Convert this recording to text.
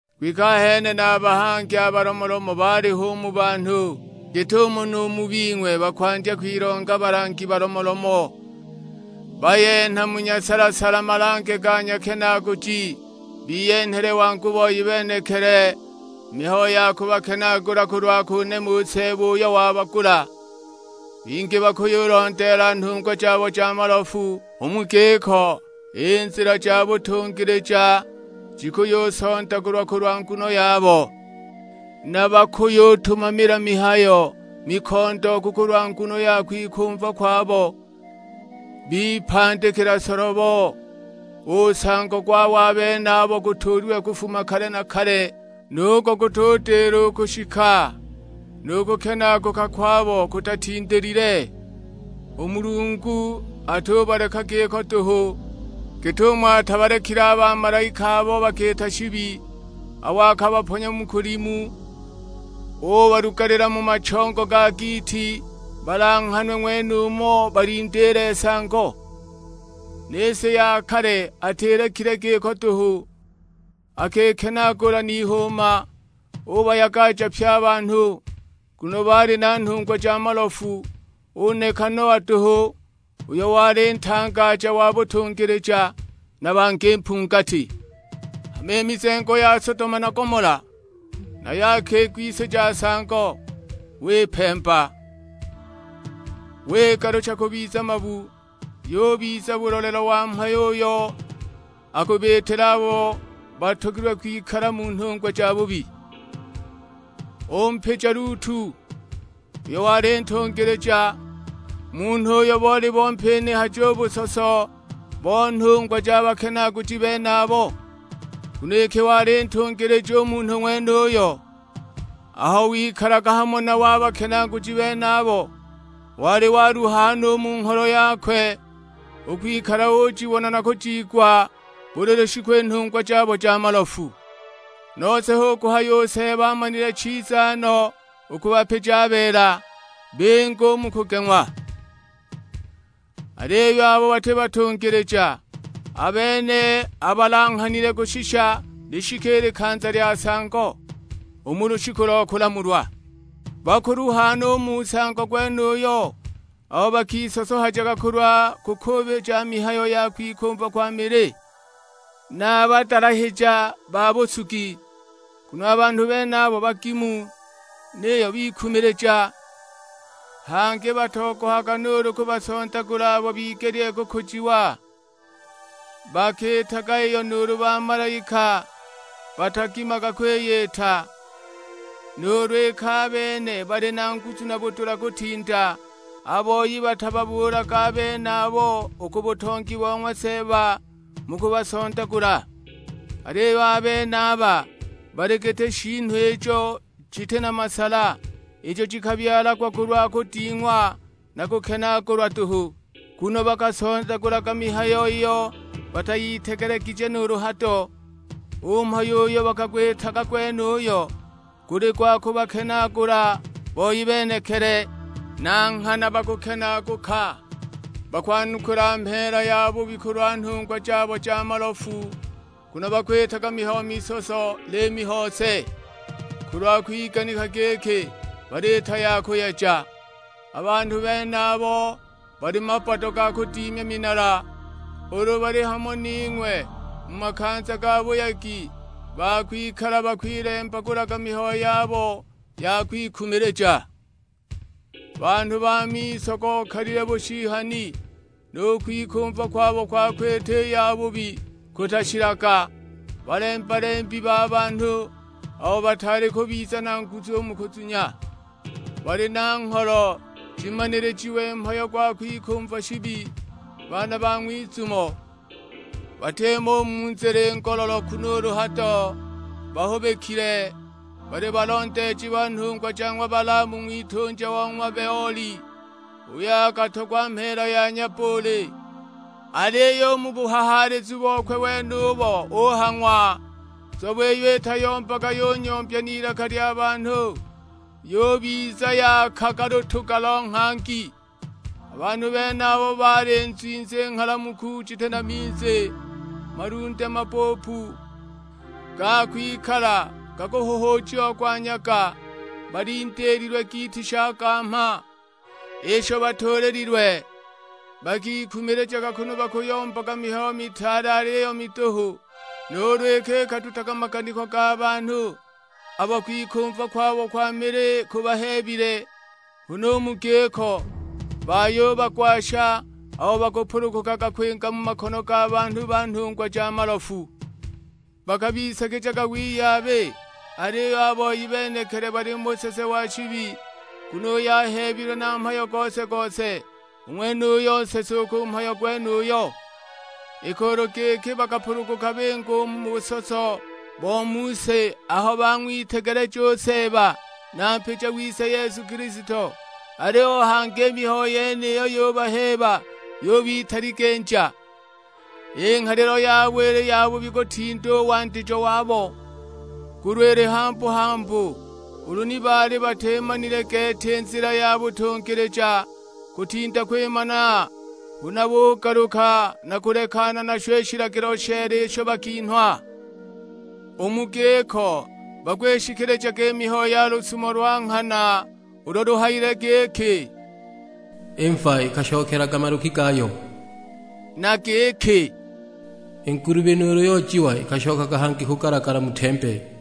Kwike ahene na a bahangi a balomolomo baaliho u mu banhu, git'umo nu mu bing'we bakwandya kwilonga balangi balomolomo; bayenha mu nyasala-sala malange ga, nyakenaaguji, biyenhele wangu boi benekili mihayo ya kubakenaagula kulwa kunema u Seeba uyo wabagula. Bingi bakuyulondeela nhungwa jabo ja malofu, u mu giko i nzila ja butungilija jikuyusondagulwa kulwa nguno yabo. Na bakuyutumamila mihayo mikondooku kulwa nguno ya kwikumva kwabo, bipandikila solobo; u nsango gwabo a benabo gutuulilwe kufuma kale na kale, nugo gutudila u kushika, nu kukenaaguka kwabo kutatindilile! U Mulungu atubaleka giko duhu; git'umo atabalekile a bamalaika abo bakiita shibi, abo akabaponya mu kulimu, ubalugalila mu machongo ga giiti balanghanwe ng'wenumo balindiile nsango. Ni si ya kale atilekile giko duhu, akikenaagula n'ihuuma; ubayagaja pye a banhu, nguno baali na nhungwa ja malofu, uneka Noa duhu uyo wali ntangaja wa butungilija, na bangi mpungati. Hama i mizengo ya Sodoma na Gomola, nayo akigwisija nsango, wipemba. Wigalucha kubiza mabu, yubiza bulolelo wa mhayo uyo akubiitila abo batogilwe kwikala mu nhungwa jabubi. Umpija Lutu, uyo wali ntungilija; munhu uyo boli bompinihaja u busoso bo nhungwa ja bakenaaguji benabo. (Nguno iki wali ntungilija u munhu ng'wenuyo, aho wikalaga hamo nabo a bakenaaguji benabo, wali waluha no u mu ngholo yakwe, u kwikala ujibona na kujiigwa buli lushiku i nhungwa jabo ja malofu). Nose hu kuhaya u Seeba amanile chiza no u kubapija a beela, binge u mu kugeng'wa. Aliyo abo bati batungilija, a bene abalanghanile kushisha lishike i likanza lya nsango, u mu lushiku lo kulamulwa. Bakuluha no u mu nsango gwenuyo abo bakisosohajaga kulwa kukuubilija mihayo ya kwikumva kwa mili, na a badalahija ba busugi. Nguno a banhu benabo bagimu, niyo bikumilija; hangi batogohaga nuulu kubasondagula abo bigelile kukujiwa. Bakiitaga iyo nuulu bamalaika batagimaga kwiyita, nuulu iki a bene bali na nguzu na budula kutinda. A boi batababuulaga a benabo u ku butongi bo ng'wa Seeba mu kubasondagula. Aliyo a benaba bali giti shiinu ijo jiti na masala, ijo jikabyalagwa kulwa kuding'wa na kukenaagulwa duhu; nguno bakasondagulaga mihayo iyo batayitegelegije nuulu hado. U mhayo uyo bakagwitaga gwenuyo guli gwa kubakenaagula boi benekili; na nghana bakukenaaguka. Bakwanukula mheela yabubi kulwa nhungwa jabo ja malofu, nguno bakwitaga mihayo misoso na liimi hose, kulwa kwiganika giki baliita ya kuyeja. A banhu benabo bali mabbado ga kudimya minala. Ulu bali hamo ning'we mu makanza ga buyegi ba kwikala bakwilembagulaga mihayo yabo ya kwikumilija! Banhu ba miso gokalile bushihani, nu kwikumva kwabo kwa kwita i yabubi kutashilaga. Balemba-lembi ba banhu abo bataali kubiza na nguzu u mu kuzunya. Bali na ngholo jimanilijiwe mhayo gwa kwikumva shibi; baana ba ng'wizumo! Batimo u mu nzila i ngololoku nuulu hado, bahubikile; bali balondeeji ba nhungwa ja ng'wa Balaamu ng'witunja o ng'wa Beoli, uyo akatogwa mheela ya nyabbuuli. Aliyo u mu buhahaalizu bokwe wenubo uhang'wa, nzobe iyo itayombaga yunyombya n'ilaka lya banhu; yubiza yakaga lutuga lo nghangi! A banhu benaba bali nzwinzi nghalamuku jiti na minzi, malunde mabbuupu, ga kwikala gakuhuhuujiagwa nyaga; balindiililwe giiti sha gamha, isho batuulililwe. Bakikumilijaga kunu bakuyombaga mihayo mitaale aliyo miduhu, nuulu iki ikadutaga maganiko ga banhu abo kwikumva kwabo kwa mili kubaheebile; huna u mu giko bayubagwasha abo bakupulugukaga kwinga mu makono ga banhu ba nhungwa ja malofu. Bakabisagijaga wiyabi, aliyo a boi benekili bali mu busese wa shibi, nguno uyo aheebilwe na mhayo gose-gose, u ng'wenuyo nsese u ku mhayo gwenuyo. Iki ulu giki bakapuluguka binga u mu busoso bo mu si aho bang'witegeleja u Seeba na Mpija wise Yesu Kilisto, aliyo hangi i mihayo yeniyi yubaheeba yubitaliginja, i nghalilo yabo ili yabubi kutinda u wandijo wabo. Nguno ili hambu-hambu ulu ni baali batimanile gete i nzila ya butungilija, kutinda kwimana huna bugaluka na kulekana nasho i shilagilo sheela isho bakinhwa. U mu giko bakwishikilijaga i mihayo ya lusumo lwa nghana ulo luhayile giki, "I mva ikashokelaga maluki gayo!" Na giki, "I ngulubi nuulu yoojiwa ikashokaga hangi kugalagala mu tembe!"